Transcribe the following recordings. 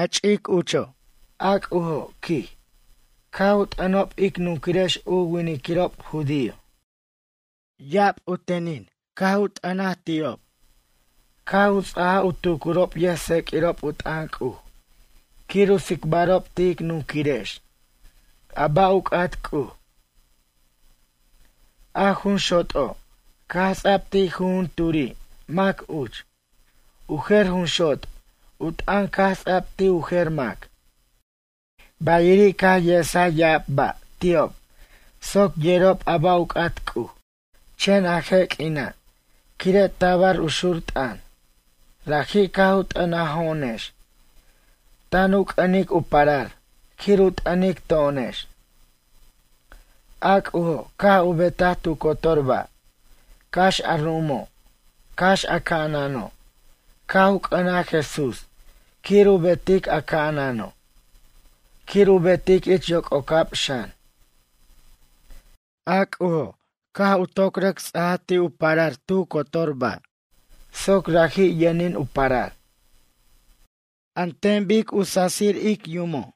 Ch'ic uch, a C'ujo', quij, caj u t'ʌnob ic nunquirex u winiquirob judío. Ya'ab u tenin caj u t'an ti'ob, caj u ts'aja u tucurob yʌjtseq'uirob u t'ʌn C'uj quir u tsicbarob ti' ic nunquirex a ba' u c'at C'uj. A jun xot'o' caj ts'a'b ti' jujunturi mac uch, u jer jun xot' u t'ʌn caj ts'a'b ti' u jer mac. Bayiri' caj esaj ya'ab ba' ti'ob soc yerob a ba' u c'at C'uj. Chen a je' q'uina', quire' tab u xur t'ʌn raji' caj u t'ʌnajo'onex, tan u c'ʌnic u parar quir u t'ʌnic to'onex. A C'ujo' caj u betaj tu cotor ba', cax a ru'umo', cax a ca'anano' caj u c'ʌnaj Jesús quir u betic a ca'anano', quir u betic ich yoc'ocab xan. A C'ujo', caj u toc rʌc ts'aj ti' u parar tu cotor ba' soc raji' yʌnin u parar. An ten bic cu sasir ic yumo',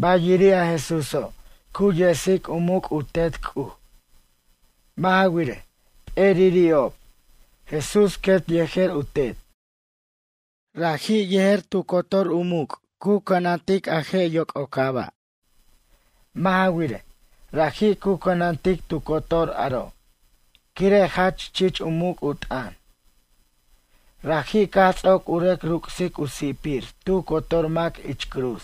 bayiri' a Jesúso' cu yesic u muc' u Tet C'uj. Mʌ' ja wirej, p'eriri'ob, Jesús quet yejer u Tet. Raji', yejer tu cotor u muc' cu cʌnantic a je' yoc'ocab. Mʌ' ja wirej, raji' cu cʌnantic tu cotor aro' quire' jach chich u muc' u t'ʌn. Raji' caj ts'oc u rʌc ruc'sic u si'pir tu cotor mac ich cruz.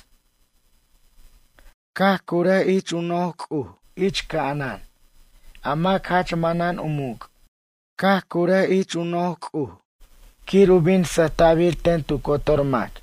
Caj curaj ich u noj C'uj ich ca'anan, a mac jach manan u muc'. Caj curaj ich u noj C'uj quir u bin sʌjta'bir ten tu cotor mac.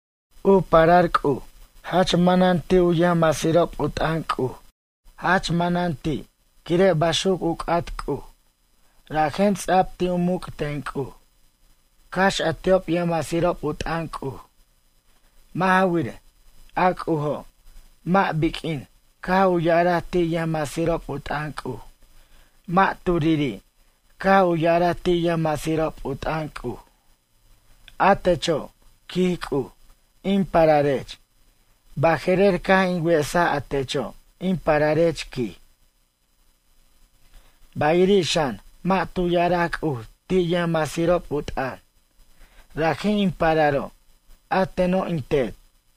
U parar C'uj jach manan ti' u yʌjmasirob u t'ʌn C'uj. Jach manan ti' quire' baxuc u c'at C'uj, rajen ts'a'b ti' u muc' ten C'uj, cax a ti'ob yʌjmasirob u t'ʌn C'uj. Mʌ' ja wirej, a C'ujo' mʌ' biq'uin caj u ya'araj ti' yʌjmasirob u t'ʌn C'uj, mʌ' turiri' caj u ya'araj ti' yʌjmasirob u t'ʌn C'uj: A techo', quij C'uj, in pararech, baje'rer caj in wesaj a techo', in pararech quij. Bayiri' xan mʌ' tu ya'araj C'uj ti' yʌjmasirob u t'ʌn: Raji' in pararo', a teno' in Tet.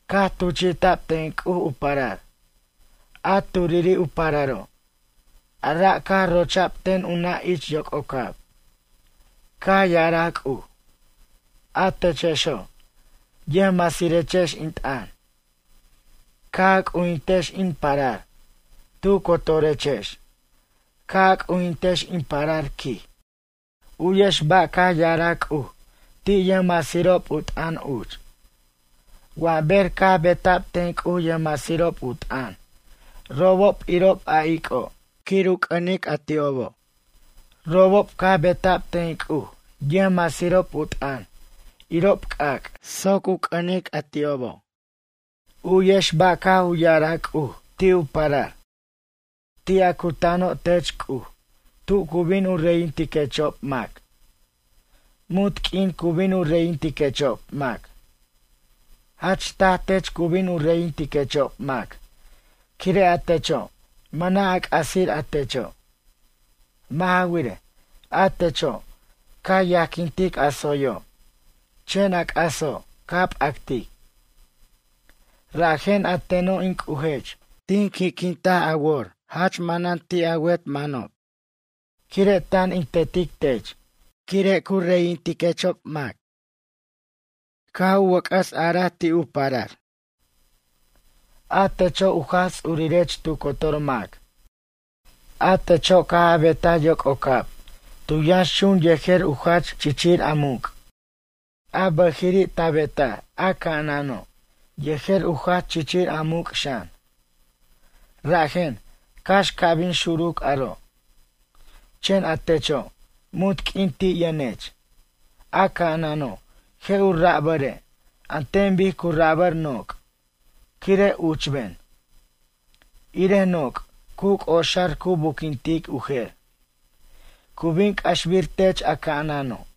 Caj tuchi'ta'b ten C'uj u parar, a turiri' u pararo'. A ra' caj rocha'b ten u nʌ' ich yoc'ocab. Caj ya'araj C'uj: A techexo', ʌjmasirechex in t'ʌn, ca' a c'ujintex in parar, tu cotorechex ca' a c'ujintex in parar quij. U'yex ba' caj ya'araj C'uj ti' yʌjmasirob u t'ʌn uch: Wa ber caj beta'b ten C'uj yʌjmasirob u t'ʌn robob irob a ic'o' quir u c'ʌnic a ti'obo'. Robob caj beta'b ten C'uj yʌjmasirob u t'ʌn irob c'ac' soc u c'ʌnic a ti'obo'. U'yex ba' caj u ya'araj C'uj ti' u parar: Ti' a cutano' tech C'uj tu cu bin u reyintiquechob mac. Munt q'uin cu bin u reyintiquechob mac. Jach taj tech cu bin u reyintiquechob mac quire' a techo' mʌna' a c'asir a techo'. Mʌ' ja wirej, a techo' ca yajquintic a tsoyo', chen a c'aso' ca p'actic. Rajen a teno' in C'ujech tin qui'quint a wor jach manan ti' a wet manob, quire' tan in tetic tech quire' u reyintiquechob mac. Caj wʌc'ʌs a'araj ti' u parar: A techo' u Jaj Ts'urirech tu cotor mac. A techo' caj a betaj yoc'ocab tu yʌnxchun yejer u jach chichir a muc'. A bʌjiri' ta betaj a ca'anano' yejer u jach chichir a muc' xan. Rajen, cax ca' bin xuruc aro', chen a techo' munt q'uin ti' yʌnech. A ca'anano' je' u rabare' an ten bic cu rabar noc' quire' uchben. Irej noc' cu c'oxar cu buquintic u jer. Cu bin c'axbir tech a ca'anano'.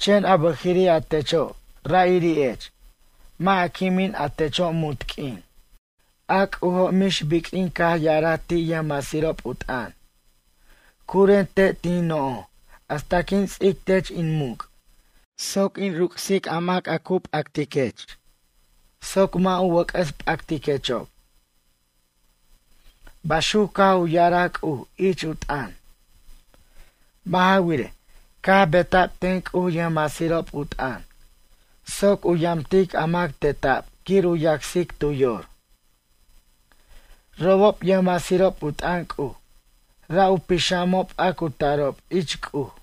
Chen a bʌjiri' a techo' ra'iri'ech, mʌ' a quimin a techo' munt q'uin. A C'ujo' mix biq'uin caj ya'araj ti' yʌjmasirob u t'ʌn: Curen te' tin noj hasta quin ts'ic tech in muc' soc in ruc'sic a mac a cu p'actiquech soc mʌ' u wʌc'ʌs p'actiquechob. Baxuc caj u ya'araj C'uj ich u t'ʌn. Mʌ' ja wirej, caj beta'b ten C'uj yʌjmasirob u t'ʌn soc u yamtic a mac teta'b quir u yacsic tu yor. Robob yʌjmasirob u t'ʌn C'uj ra' u pixamob a cu tarob ich C'uj.